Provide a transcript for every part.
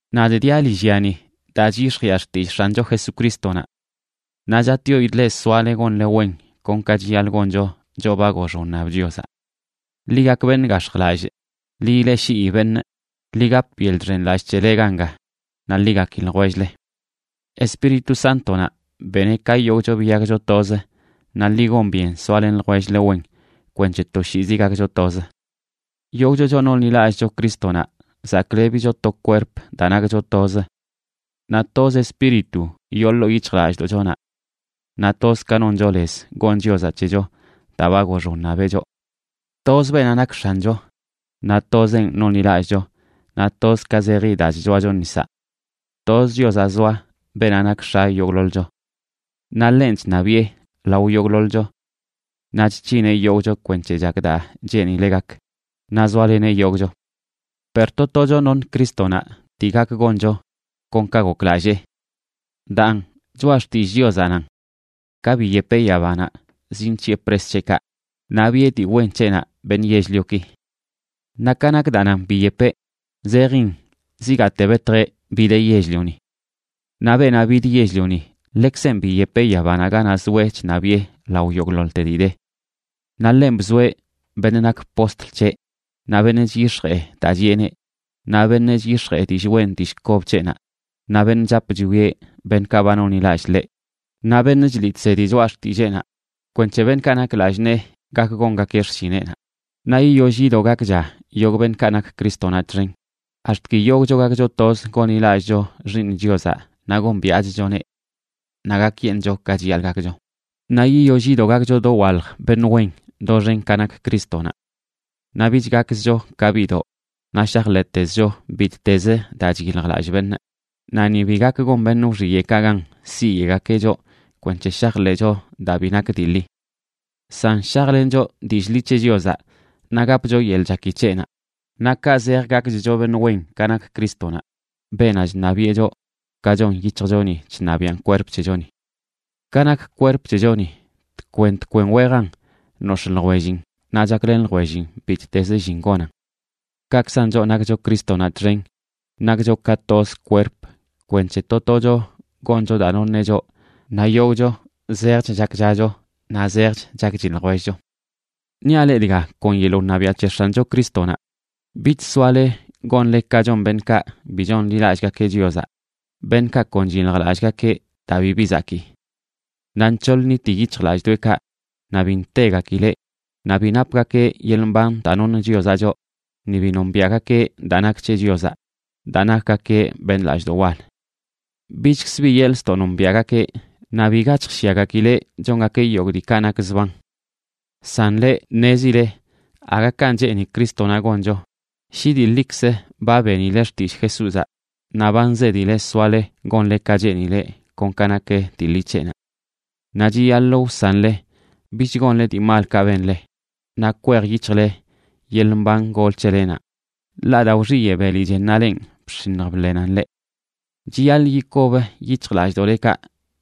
Nadꞌ diaꞌ lillyani daa chyix̱jiꞌa xtillꞌ X̱ancho Jesucrístonaꞌ. Naꞌ chatꞌyoidꞌ leꞌ soale gonle wen kon ka chiyaḻꞌ goncho choꞌ ba gox wṉab Chiozaꞌ. Ḻi gak beṉꞌ gax̱jlallꞌ, ḻi ileꞌshii beṉꞌ, ḻi gap yeḻꞌ chxenlallꞌ c̱hele ganga naꞌ ḻi gaki ljwell-le. Espíritu Sántonaꞌ beneꞌ ka yogꞌcho biyakcho toz, naꞌ ḻi gon byen soalen ljwell-le wen kwenc̱he toshiizi gakcho toz. Yogꞌcho, choꞌ nonḻilallꞌcho Crístonaꞌ, zaklebicho to kwerp daa nakcho toz; naꞌ toz Espíritu yoo ḻoo yic̱hjlallꞌdoꞌchonaꞌ; naꞌ toz ka noncho lez gon Chiozaꞌ c̱hecho daa ba gox wṉabeꞌ choꞌ. Tozə beenaꞌ nak X̱ancho, naꞌ tozeꞌn nonḻilallꞌcho, naꞌ toz ka zeji daa chchoacho nisaꞌ. Tozə Chiozaꞌ zoa, beenaꞌ nak X̱a yogꞌḻoḻcho. Naꞌ ḻenꞌ chṉabiꞌe lao yogꞌḻoḻcho; naꞌ chc̱hineꞌ yogꞌcho kwenc̱he chak daa cheenileꞌ gak, naꞌ zoaleneꞌ yogꞌcho. Per to tocho noṉ Crístonaꞌ dii gak goncho kon ka goklallee. Daan, choꞌa xtillꞌ Chiozaꞌ nan: Ka biyepeꞌ yabanaꞌ, zinc̱hiꞌe pres c̱heꞌkaꞌ, naꞌ biꞌe dii wen c̱heꞌnaꞌ beṉꞌ yell-lioki. Naꞌ ka nak daa nan “biyepeꞌ”, zejin zigaate betjeꞌ bideꞌ yell-lioni. Naꞌ beenaꞌ bid yell-lioni, ḻekzenꞌ biyepeꞌ yabanaꞌ ganaꞌ zoeꞌ chṉabiꞌe lao yogꞌḻoḻte dii de. Naꞌ ḻenꞌ bzoeꞌ beṉꞌ nak postl c̱heꞌ, naꞌ beṉꞌ chyix̱jee daa chiꞌeneꞌ, naꞌ beṉꞌ chyix̱jee dillꞌ wen dillꞌ kob c̱heꞌnaꞌ, naꞌ beṉꞌ chap chwieꞌ beṉꞌkaꞌ ba nonḻilallꞌ ḻeꞌ, naꞌ beṉꞌ chliꞌ chsedi choꞌa xtilleenaꞌ, kwenc̱he beṉꞌkaꞌ nak lallꞌ nee gak gongakeꞌ xshineꞌnaꞌ, naꞌ yiyoll yido gakcha yogꞌ beṉꞌkaꞌ nak Crístonaꞌ txen, ax̱t ki yogꞌcho gakcho toz gonḻilallꞌcho Xiiṉ Chiozaꞌ naꞌ gombiaꞌchchoneꞌ. Naꞌ gakyeṉꞌcho ka chiyaḻꞌ gakcho, naꞌ yiyoll yido gakcho dowalj beṉꞌ wen doxen ka nak Crístonaꞌ. Naꞌ bich gakzcho ka biꞌdoꞌ naꞌ shajḻeꞌtezcho bittezə daa chyiljlallꞌ beṉꞌ, naꞌ ni bi gak gon beṉꞌ wxiyeꞌkaꞌ gan siyeꞌgakeꞌ choꞌ kwenc̱he shajḻeꞌcho daa bi nak dii ḻi. San shajlencho dillꞌ ḻi c̱he Chiozaꞌ naꞌ gapcho yeḻꞌ chaki c̱heꞌnaꞌ, naꞌ kaꞌ zej gakchcho beṉꞌ wen ka nak Crístonaꞌ, beenaꞌ chṉabiꞌe choꞌ, ka chon yic̱hjchoni chṉabiaꞌn kwerp c̱hechoni. Ka nak kwerp c̱hechoni, tkwen tkwen wejan nox̱ꞌ ljwellin naꞌ chaklen ljwellin bittezə llin gonan. Kaꞌkzan choꞌ nakcho Crístonaꞌ txen nakcho ka toz kwerp kwenc̱he to tocho goncho daa noṉeꞌ choꞌ, naꞌ yogꞌcho zejch chakchacho naꞌ zejch chakchi ljwellcho. Niaꞌ leꞌ dga kon yeḻꞌ wṉabiaꞌ c̱he X̱ancho Crístonaꞌ: bich soale gonle ka chon beṉꞌkaꞌ bi chonḻilallꞌgakeꞌ Chiozaꞌ, beṉꞌkaꞌ kon chyiljlallꞌgakeꞌ daa bibi zakii, naꞌ nc̱hoḻ nṉiti yic̱hjlallꞌdoꞌekaꞌ naꞌ bi ntegakileꞌ, naꞌ bi napgakeꞌ yeḻꞌ mban daa noṉ Chiozaꞌ choꞌ, ni bi nombiaꞌgakeꞌ daa nak c̱he Chiozaꞌ, daa nakgakeꞌ beṉꞌ lallꞌdoꞌ wal. Bichkzə bi yeḻꞌ ztoꞌ nombiaꞌgakeꞌ, naꞌ biga chjshyagakileꞌ chongakeꞌ yogꞌ diikaꞌ nak zban. San leꞌ, ṉezile aga kanꞌ cheeni Crístonaꞌ goncho, shi dii ḻikzə ba benile xtillꞌ Jesúzaꞌ naꞌ ba nzedile soale gonle ka cheenileꞌ kon ka nak dii ḻi c̱heꞌnaꞌ. Naꞌ chiyaḻꞌ wsanle bich gonle dii malkaꞌ benle, naꞌ kwej yic̱hjle yeḻꞌ mban gol c̱helenaꞌ, ḻaꞌ daa wxiyeꞌ beli chennaꞌ lenꞌ, bx̱iṉj bḻenan leꞌ. Chiyaḻꞌ yikob yic̱hjlallꞌdoꞌlekaꞌ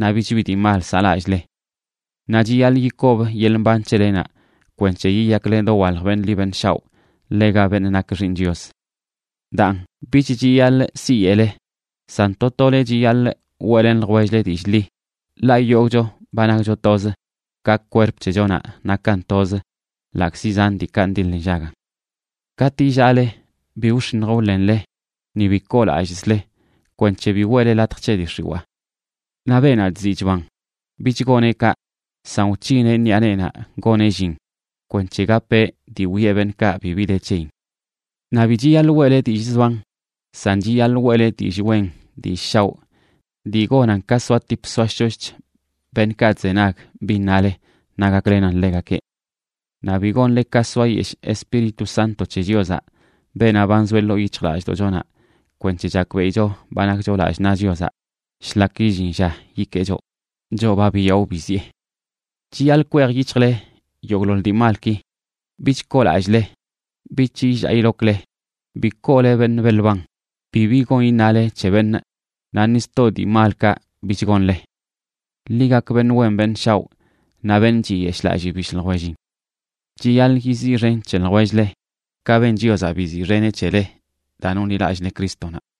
naꞌ bich bi dii mal saꞌlallꞌle. Naꞌ chiyaḻꞌ yikob yeḻꞌ mban c̱helenaꞌ kwenc̱he yiyakle dowalj beṉꞌ ḻi beṉꞌ shaoꞌ ḻega beṉꞌ nak xiiṉ Chios. Daan, bich chiyaḻꞌ siyeꞌle, san to tole chiyaḻꞌ weꞌlen ljwell-le dillꞌ ḻi, ḻaꞌ yogꞌcho ba nakcho toz, ka kwerp c̱hechonaꞌ nakan toz, ḻaꞌkzi zan diikaꞌ ndiḻ nllagan. Katꞌ illaale, bi wx̱iṉj wḻenle ni bi koolallꞌzle, kwenc̱he bi weꞌle latj c̱he dii x̱iwaa. Naꞌ beenaꞌ chziꞌ chban, bich goneꞌ kaꞌ, san wc̱hineꞌ ṉiꞌa neenaꞌ goneꞌ llin kwenc̱he gapeꞌ dii wiꞌe beṉꞌkaꞌ bibi de c̱heyin. Naꞌ bi chiyaḻꞌ weꞌle dillꞌ zban, san chiyaḻꞌ weꞌle dillꞌ wen dillꞌ shaoꞌ dii gonan ka soatip soashoshch beṉꞌkaꞌ chzenag bin nale naꞌ gaklenan ḻegakeꞌ. Naꞌ bi gonle ka soayeshꞌ Espíritu Santo c̱he Chiozaꞌ, beenaꞌ ba nzoeꞌ ḻoo yic̱hjlallꞌdoꞌchonaꞌ kwenc̱he chakbeꞌicho ba nakcho lallꞌ naꞌ Chiozaꞌ shlak illin lla yikee choꞌ, choꞌ ba biyaꞌo biziꞌe. Chiyaḻꞌ kwej yic̱hjle yogꞌḻoḻ dii malki: bich koolallꞌle, bich illaa ilokle, bi koole beṉꞌ beḻ ban, bibi gon iṉale c̱he beṉꞌ naꞌ ni sto dii malkaꞌ bich gonle. Ḻi gak beṉꞌ wen beṉꞌ shaoꞌ naꞌ beṉꞌ chiyeshꞌlalli bishꞌ ljwellin. Chiyaḻꞌ yiziꞌxen c̱he ljwell-le, ka ben Chiozaꞌ biziꞌxeneꞌ c̱hele daa nonḻilallꞌle Crístonaꞌ.